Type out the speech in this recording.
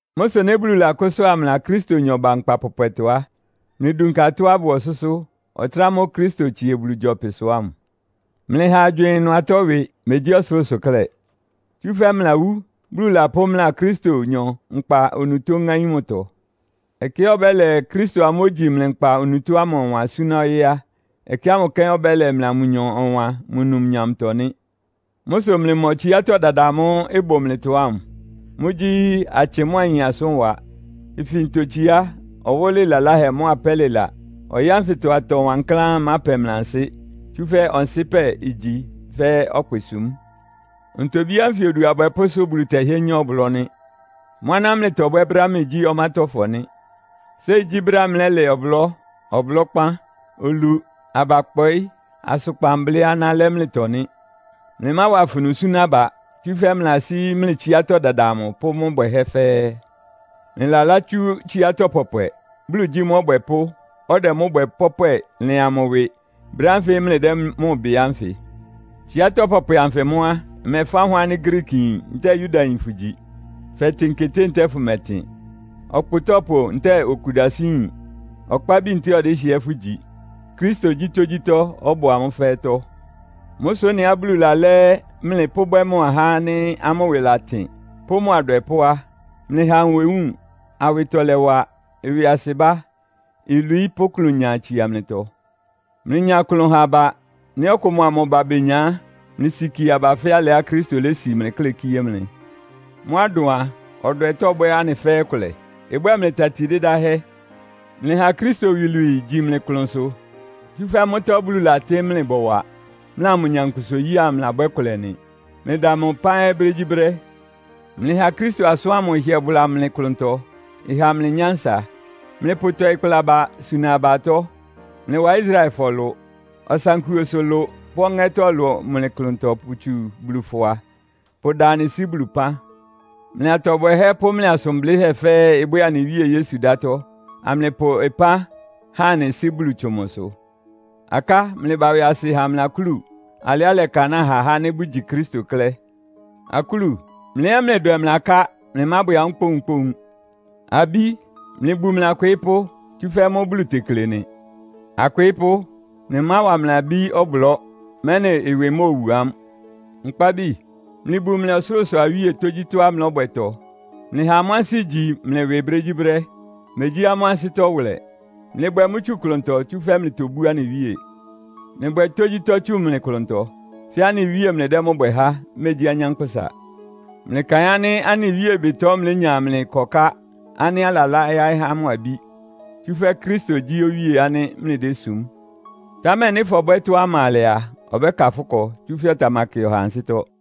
Mʋ́ sʋ nɩ́ Bulu lakʋ́sʋ́a mlɩa Kristonyɔ ba nkpa pɔpwɛtɔ á, mlɩdunka atɔ́á ɩbʋ ɔsʋ́sʋ́, ɔtɩ́nɛ́ ámʋ́ʋ́ Kristo tsie Bulu gyɔpɩsʋ ámʋ. Mlɩha agywɩɩn ɩnʋ atɔ́ ɩwɩ, megyí ɔsʋlʋ́sʋ klɛ́. Tsúfɛ́ mlɩlawú, Bulu lapʋ́ mlɩa Kristonyɔ nkpa onutó ŋáín mʋtɔ. Ɛkɛá ɔbɛ́lɛ Kristo amʋ́ʋ́ ogyi mlɩ nkpa onutó ámʋ ɔwan súná ɔyɩ́ á, ɛkɛ ámʋ kɛ́n ɔbɛ́lɛ mlɩa mʋnyɔ ɔwan mʋ numnyamtɔ nɩ́. Mʋ́ sʋ mlɩmɔ tsiátɔ́ dada amʋ́ʋ́ ɩbʋ mlɩtɔ ámʋ. Mʋ́gyí; atsɩ mʋ́a ayin asʋ́nwa, ifintotsiá, ɔwɔ́lɩ laláhɛ mʋ́a pɛ́lɩla. Ɔyɩ́ ánfɩtɔ atɔ wankláán ɩmápɛ mlɩ ansɩ́, tsúfɛ́ ɔnsɩ́pɛ igyi fɛ́ ɔkpɩsúm. Ntobí ánfɩ odu abwɛpʋ́sʋ́ Bulu tɛhɩ́ɛ́ nyá ɔblɔ́ nɩ́. Mʋ́ aná mlɩtɔbwɛ́ brɛ́á mlɩgyí ɔmátɔ́fɔ nɩ́. Séi gyí brɛ́á mlɛ́lɛ ɔblɔ́, ɔblɔ́kpán, olu, abakpɔɩ́, asʋkpan blɩ́ aná lɛ́ mlɩtɔ nɩ́. Mlɩmáwa afunu súná aba, tsúfɛ́ mlɩlasí mlɩ tsiátɔ́ dada amʋ pʋ́ mʋ́ bwɛhɛ́ fɛ́ɛ́. Mlɩlalátsú tsiátɔ́ pɔpwɛ. Bulu gyí mʋ́ Ɔbwɛpʋ́, ɔdɛ mʋ́ bwɛ pɔ́pwɛ lɩan mʋ ɩwɩ brɛ́ ánfɩ mlɩdɛ́ mʋ bɩ ánfɩ. Tsiátɔ́ pɔpwɛ anfɩ mʋ́ á, ɩmɛfáhʋn ánɩ́ Griikiyin ntɛ́ɛ Yudayin fʋgyi. Fɛtɩn keté ntɛ́ɛ fʋmɛtɩn, ɔkpʋtɔ́pʋ ntɛ́ɛ okudasɩ́yin, ɔkpábi ntɛ́ɛ ɔdɩ́hɩɛ fʋ́gyi. Kristo gyí tógyítɔ́, ɔbʋ amʋ́ fɛ́ɛ́tɔ́. Mʋ́ sʋ ɩ́nɩá Bulu lalɛ́ mlɩ pʋ́bwɛ́ mʋ ahá ánɩ́ amʋ́ ɩwɩ latɩn pʋ́ mʋ adwɛpʋ́ á, mlɩha nwewúun, awɩtɔlɛwa, ɩwɩasɩbá, ilwií pʋ́ klʋnya itsia mlɩtɔ. Mlɩnya ɩklʋn ha aba. Nɩ́ ɔkʋ mʋa mʋ ba benya á, mlɩsikie aba fɛ́ alɩá Kristo lési mlɩ klɛ́ kíé mlɩ. Mʋ́á ɩdʋn a, ɔdwɛ tɔ́bwɛ́ anɩ fɛ́ɛ́ ɩkʋlɛ. Ɩbwɛ́ɛ mlɩ tati dɩdáhɛ́. Mlɩha Kristo iwilwii igyí mlɩ klʋnsʋ, tsúfɛ́ mʋ́tɔ́ Bulu latɩ́ mlɩ bɔwa; mlɩa mʋ nyankpʋsa-oyí ámʋ mlɩlabwɛ́ kʋlɛ nɩ. Mlɩda mʋ ɩpán ɛ́ brégyíbrɛ́. Mlɩha Kristo asʋ́n ámʋ ɩhɩɛ bʋla mlɩ klʋntɔ, ɩha mlɩ nyánsa. Mlɩpʋtɔɩ kpla aba, suna aba atɔ́. Mlɩwa Israelfɔ ɩlʋ, ɔsankuosʋ ɩlʋ pʋ́ ɔŋɛ́tɔ́ ɩlʋ mlɩ klʋntɔ pʋtsu Bulu fʋa, pʋda anɩ Sɩ́ Bulu ɩpán. Mlɩ atɔ bwɛhɛ́ pʋ́ mlɩ asʋn blɩ́hɛ́ fɛ́ɛ́ ɩbwɛ́ɛ anɩ Wíe Yesu ɩdátɔ́, amlɩpʋ ɩpán ha anɩ Sɩ́ Bulu tsʋn mʋsʋ. Aká, mlɩba ɩwɩasɩ ha mlɩ akúlu alɩá ɩlɛkanáa ha ahá ánɩ́ bʋgyi Kristo klɛ́. Akúlu, mlɩ ɛ́ mlɩdwɛ mlɩ aká. Mlɩmábwɛ amʋ́ kpóunkpóun. Abí, mlɩbu mlɩ akwɩɩ́pʋ́, tsúfɛ́ mʋ́ Bulu tekle nɩ. Akwɩɩ́pʋ́, mlɩmáwa mlɩ abí ɔblɔ́, mɛ́nɩ ɩwɩ móowu amʋ́. Nkpábi, mlɩbu mlɩ ɔsʋlʋ́sʋ awíe tógyítɔ́á mlɔ́bwɛtɔ. Mlɩha amʋ́ ansɩ́ igyi mlɩ ɩwɩ brégyíbrɛ́, megyí amʋ́ ansɩ́tɔ́ wʋlɛ. Mlɩbwɛ mʋ́ tsú klʋntɔ, tsúfɛ́ mlɩtobú anɩ Wíe. Mlɩbwɛ tógyítɔ́ tsu mlɩ klʋntɔ, fɛ́ anɩ Wíe mlɩdɛ́ mʋ́ bwɛ há, megyí anyánkpʋ́sa. Mlɩkaɩn ánɩ́ anɩ Wíe ɩbɩtɔ mlénya mlɩ ɩkɔká ánɩ́ alalá yáɩ́ mʋ abí. Tsúfɛ́ Kristo gyí Owíe ánɩ́ mlɩdésum. Támɛ nɩ́ fɔbwɛ́ tɔ́á ɩma alɛ a, ɔbɛ́ka fʋ́ ɩkɔ, tsúfɛ́ ɔtamakɩ ɔhaa ansɩ́tɔ́.